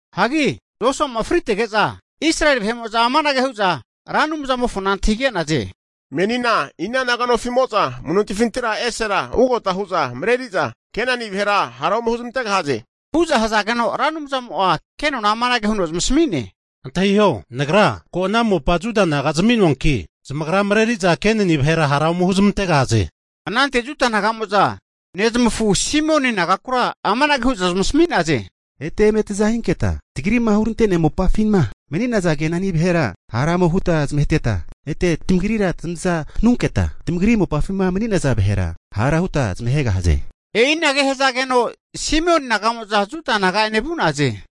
Hagi Josua'ma fritege'za Israeli vahe'mo'za amanage hu'za Ra Anumzamofona antahige'naze. Menina ina naga nofi'mo'za amu'nontifintira esera vugota hu'za mareriza Kenani vahera hara ome huzmantegahaze? Hu'za hazageno, Ra Anumzamo'a kenona amanage huno zamasami'ne, Antahiho, Nagra ko' ana mopa Juda naga zami'noanki zamagra mareri'za Kenani vahera hara ome huzmantegahaze. Anante Juda naga'mo'za nezmafu Simioni nagakura amanage hu'za zmasami'naze, eta eme taza hinketa tagri'ma hurante'nea mopafima mani'naza Kenani vahera hara ome huta zamaheteta, ete tamagrira tamaza hanunketa tamagri mopafima mani'naza vahera hara huta zamahegahaze. E'inage hazageno Simioni naga'mo'za Juda naga'ene vu'naze.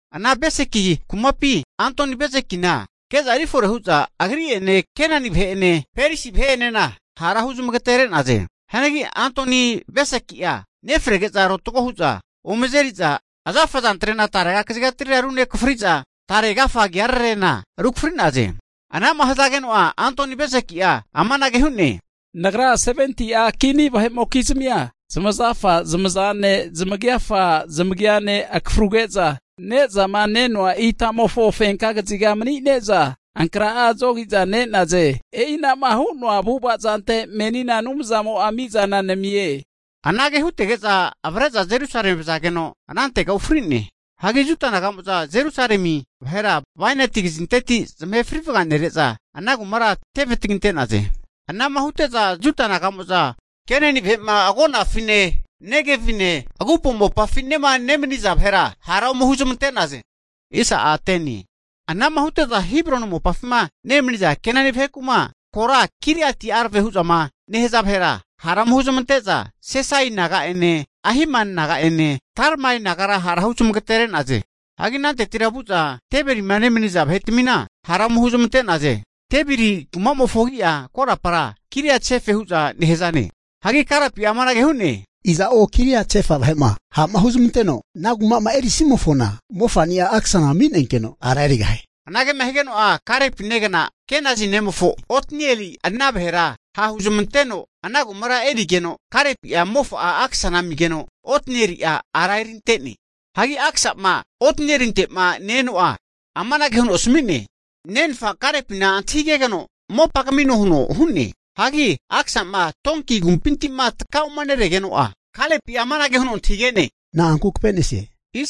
Ana Beseki kumapi Adoni-Bezekina ke'za erifore hu'za, agri'ene Kenani vahe'ene Perisi vahe'enena hara huzmagatere'naze. Hianagi Adoni-Beseki'a nefrege'za rotago hu'za ome azeri'za azafa azantrena tarega kazigatira runekafriza, tare agafa agiararena rukafri'naze. Ana'ma hazageno'a Adoni-Beseki'a amanage hu'ne, nagra 70'a kini vahe'mokizmia zamazafa zamazane, zamagiafa zamagiane akafruge'za, ne'zama nenoa itamofo fenka kaziga mani'ne'za, ankrahe'a zogi'za ne'naze. E'inama hu'noa avu'ava zante menina Anumzamo'a mizana namie. Anage hutege'za avre'za Jerusalemi vazageno anantega ufri'ne. Hagi Juda naga'mo'za Jerusalemi vahera bainati kazinteti zamahe frivaganere'za, ana kumara teve taginte'naze. Hagi ana'ma hute'za Juda naga'mo'za urami'za, Kenani vahe'ma agonafine Negevine, agupo mopafinema nemaniza vahera hara ome huzmante'naze. Ana'ma hute'za Hebroni mopafima nemaniza Kenani vaheku'ma kora Kiriat-Arba hu'zama nehaza vahera, hara ome huzmante'za Sesai naga'ene Ahimani naga'ene Talmai nagara hara zamagatere'naze. Hagi anantetira vu'za Debirima nemaniza vahetmina hara ome huzamante'naze. Debiri kumamofo agi'a korapara Kiriat-Sefa hu'za nehazane. Hagi Kalepi'a amanage hu'ne, iza'o Kiriat-Sefa vahe'ma ha'ma huzamanteno ana kumama erisimofona mofa'ni'a Aksana ami'nenkeno ara erigahie. Anagema higeno'a, Kalepi negna Kenazi nemofo Otnieli ana vahera ha'huzmanteno ana kumara erigeno, Kalepi'a mofa'a Aksana amigeno Otnieli'a ara erinte'ne. Hagi Aksa'ma Otnielinte'ma ne-eno'a amanage huno asami'ne, nenfa Kalepina antahigegeno mopa kamino huno hu'ne. Hagi Aksama donki agumpinti'ma taka'uma neregeno'a, Kalepi'a amanage huno antahige'ne, na'anku kave'nesie?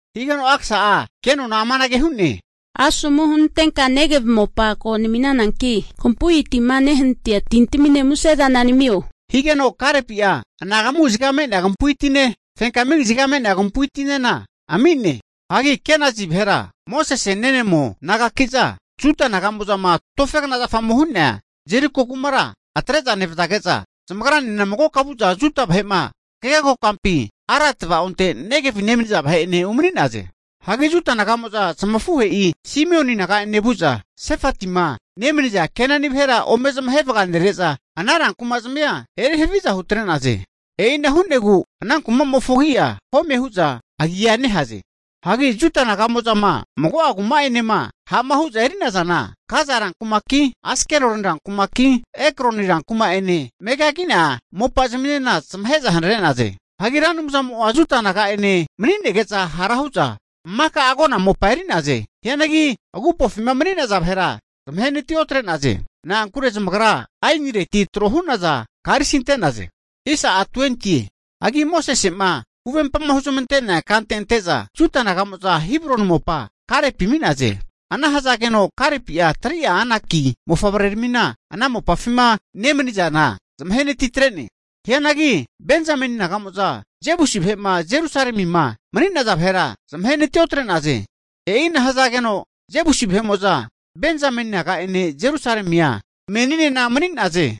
Higeno Aksa'a kenona amanage hu'ne, asomu hunantenka Negevi mopa ko nami'nananki, kampu'i tima nehanatia tintaminena musezana namio, higeno Kalepi'a anagamu kaziga me'nea kampui tine, fenkma kaziga me'nea kampu'i tinena ami'ne. Hanki Kenazi vahera Mosese nenemo nagaki'za Juda naga'mo'zama tofegna zafamo hu'nea Jeriko kumara atre'za nevazage'za, zamagrane magoka vu'za Juda vahe'ma hagege kokampi, Arad tava'onte Negevi nemaniza vahe'ene umani'naze. Hagi Juda naga'mo'za zamafuhe'i Simioni naga'ene vu'za, Sefatima nemaniza Kenani vahera ome zamahe vaganere'za ana rankuma'zmia eri haviza hutre'naze. E'ina hu'negu ana kuma'mofo agi'a Home hu'za agia nehaze. Hagi Juda naga'mo'zama mago'a kuma'enema ha'ma hu'za eri'nazana, Gaza rankumaki, Askeloni rankumaki, Ekroni rankuma'ene megagi'nea mopazminena zamahe'za hanare'naze. Hagi Ra Anumzamo'a Juda naga'ene mani'nege'za hara hu'za maka agona mopa eri'naze. Hianagi agupofima mani'naza vahera zamahenati otre'naze. Na'ankure zamagra aenireti tro hu'naza karisi ante'naze. Hagi Mosese'ma huvempama huzmante'nea kante ante'za Juda naga'mo'za Hebroni mopa Kalepi ami'naze. Ana hazageno Kalepi'a 3'a Anaki mofavreramina ana mopafima nemanizana zamahenati atre'ne. Hianagi Benzameni naga'mo'za Jebusi vahe'ma Jerusalemima mani'naza vahera zamahenati otre'naze. E'ina hazageno Jebusi vahe'mo'za Benzameni naga'ene Jerusalemia meninena mani'naze.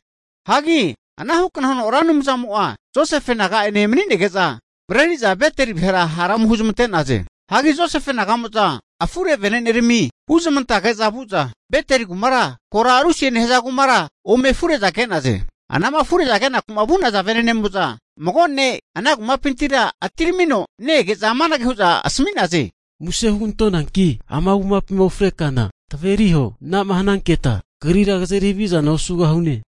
Hagi anahukna huno Ra Anumzamo'a Josefe naga'ene mani'nege'za mareri'za Beteli vahera hara ome huzamante'naze. Hagi Josefe naga'mo'za afure venenerami huzmantage'za vu'za Beteli kumakura kora Lusie nehaza kumara ome afure'za ke'naze. Anama afure'za kenaku'ma vu'naza vene'nemo'za mago ne' ana kumapintira atiramino ne-ege'za amanage hu'za asami'naze, muse hugantonanki ama kumapima ufre kana taveri huo, ana'ma hananketa kagrira kazeri havizana osugahune.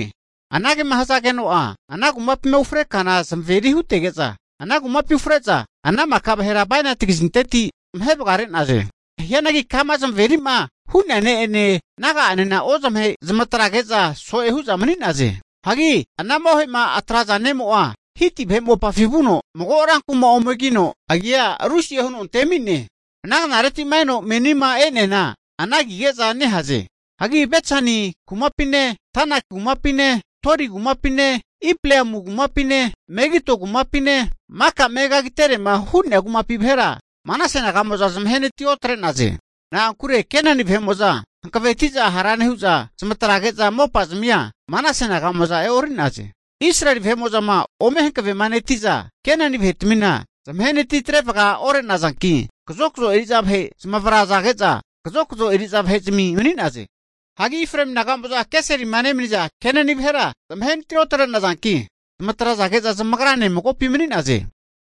Anagema hazageno'a, ana kumapima ufre kana zamaveri hutege'za, ana kumapi ufre'za ana maka vahera bainati kazinteti zamahe vagare'naze. Hianagi kama zamaveri'ma hu'nea ne'ene naga'anena ozamahe, zamatrage'za so'e hu'za mani'naze. Hagi anama ohe'ma atraza ne'mo'a Hiti vahe mopafi vuno, mago rankuma omegino ana kuma'mofo agi'a Lusie huno antemi'ne. Ana knareti'ma eno menima e'neana ana agige'za nehaze. Hagi Betsani kumapine, Tanak kumapine, Dori kumapine Ipleamu kumapine, Megido kumapine maka megagiterema hu'nea kumapi vahera Manase naga'mo'za zamahenati otre'naze. Na'ankure Kenani vahe'mo'za hanaveti'za hara nehu'za, zamatrage'za mopazmia Manase naga'mo'za e'ori'naze. Israeli vahe'mo'zama ome hankavemaneti'za Kenani vahetmina zamahenati atrevaga ore'nazanki, kazokazo eri'za vahe zamavrazage'za, kazokazo eri'za vahezmi mani'naze. Hagi Efraemi naga'mo'za Geserima nemaniza Kenani vahera zamahenati otre'nazanki, zamatrazage'za zamagrane magopi mani'naze.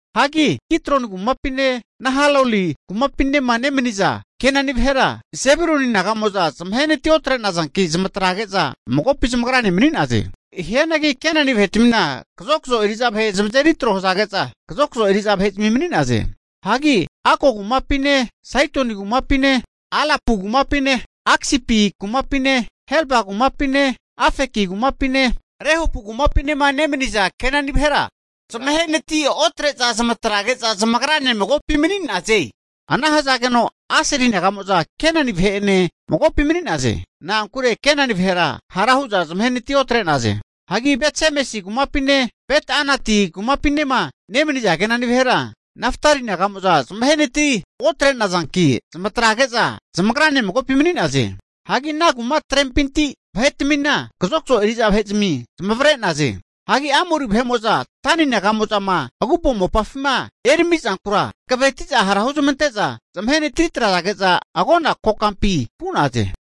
Hagi Kitroni kumapine Nahaloli kumapinema nemaniza Kenani vahera Sebuloni naga'mo'za zamahenati otre'nazanki, zamatrage'za magopi zamagrane mani'naze. Hianagi Kenani vahe'tmina kazokzo eri'za vahe zamazeri tro hazage'za kazokzo eri'za vahe mani'naze. Hagi Ako kumapine, Saidoni kumapine, Alapu kumapine, Aksipi kumapine, Helba kumapine, Afeki kumapine, Rehopu kumapinema nemaniza Kenani vahera Aseli naga'mo'za zamahenati otre'za zamatrage'za zamagrane magopi mani'naze. Ana hazageno Aseli naga'mo'za Kenani vahe'ene magopi mani'naze. Na'ankure Kenani vahera hara hu'za zamahenati otre'naze. Hagi Bet-Semesi kumapine, Bet-anati kumapinema nemaniza Kenani vahera Naftali naga'mo'za zamahenati otre'nazanki, zamatrage'za zamagrane magopi mani'naze. Hagi ana kuma'trempinti vahe'tmina kazokazo eri'za vahe'zmi zamavare'naze. Hagi Amori vahe'mo'za Dani naga'mo'zama agupo mopafima eramizankura hankaveti'za hara huzmante'za zamahenati atrege'za agona kokampi vu'naze.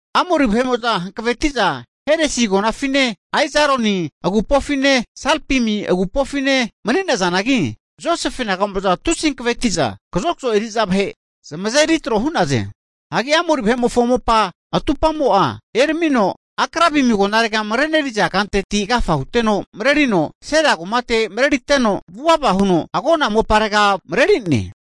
Amori vahe'mo'za hankaveti'za Heresi agonafine, Aijaloni agonafine, Salpim agonafine mani'nazanagi, Josefe naga'mo'za tusi hankaveti'za kazokzo eri'za vahe zamazeri tro hu'naze. Hagi Amori vahe'mofo mopa atupamo'a eramino, Akrabimi agonaregama mareneriza kanteti agafa huteno marerino Sela kumate mareriteno, vuvava huno agona moparega mareri'ne.